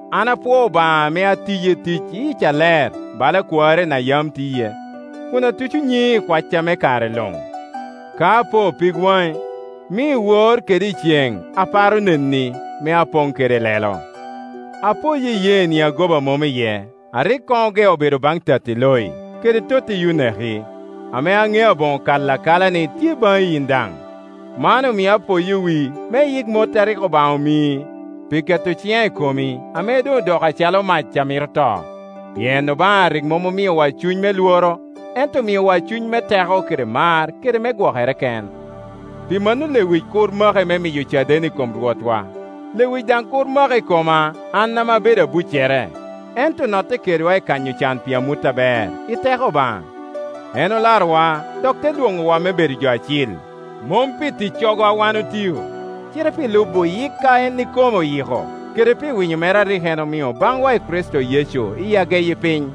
An apwoo Obaŋa ame atiye tic i yic aler, bala kwarina yam tiye, kun atuco nyiŋi i kwacca me kare luŋ. Ka apo pig waŋi, mio iwor kede iceŋ aparo neni, me apoŋ kede lelo. Apoyo iyeeni a goba mom iye, a rik koŋ ogeo bedo baŋ tatti Loi, kede totti Yuneki, ame aŋeo aboŋo kalo akala ni tye baŋi yin daŋ. Man omio apoyo wii me iyik mot a rik Obaŋa omii pi keto ciŋa i komi, ame doŋ odoko acalo mac a mito to. Pien Obaŋa rik mom omiowa cuny me lworo, ento omiowa cuny me teko kede mar kede me gwokere ken. Pi mano lewic kur maki me miyo caden i kom Rwotwa, lewic daŋ kur maki i koma an ame abedo abuccere, ento notte kedwa i kanyo can pi amut aber, i teko Obaŋa. En olarowa dok te lwoŋowa me bedo jo acil, mom pi ticcogo a wan otio, cite pi lubo yik a en ikome oyiko, kede pi winyo mere a rik en omio baŋwa i Kricito Yecu iyi ageyi piny.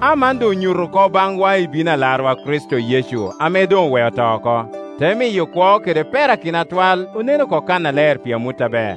Aman doŋ onyuto oko baŋwa i bino Alarwa Kricito Yecu ame doŋ oweo to oko, te miyo kwo kede perakino atwal onen oko kannaler pi amut aber.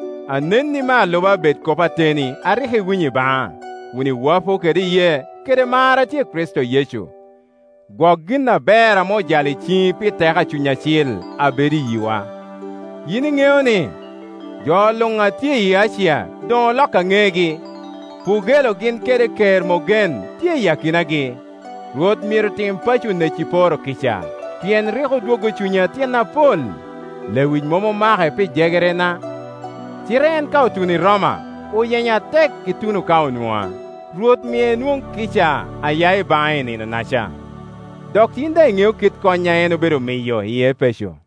Anenni me aluba bed kop ateni a rik iwinyo i baŋa, kun iwapo kede iyee kede mar a tye i Kricito Yecu. Gwok gin aber ame ojalo i ciŋi pi teko a Cuny Acil a bedo i yiwa. Yin iŋeo ni, jo luŋ a tye i Acia doŋ olokka ŋegi. Pugelo gin kede Kermogen tye i akinagi. Rwot myero tim paco Oneciporo kica, pien rik odwoggo cunya tyen apol. Lewic mom omake pi jegerena, cite en ka otuno i Roma, oyenya atek ituno ka onwoŋa. Rwot mie enwoŋ kica a ya i baŋe i Nino-naca. Dok yin daŋ iŋeo kit kony a en obedo miyo i Epeco.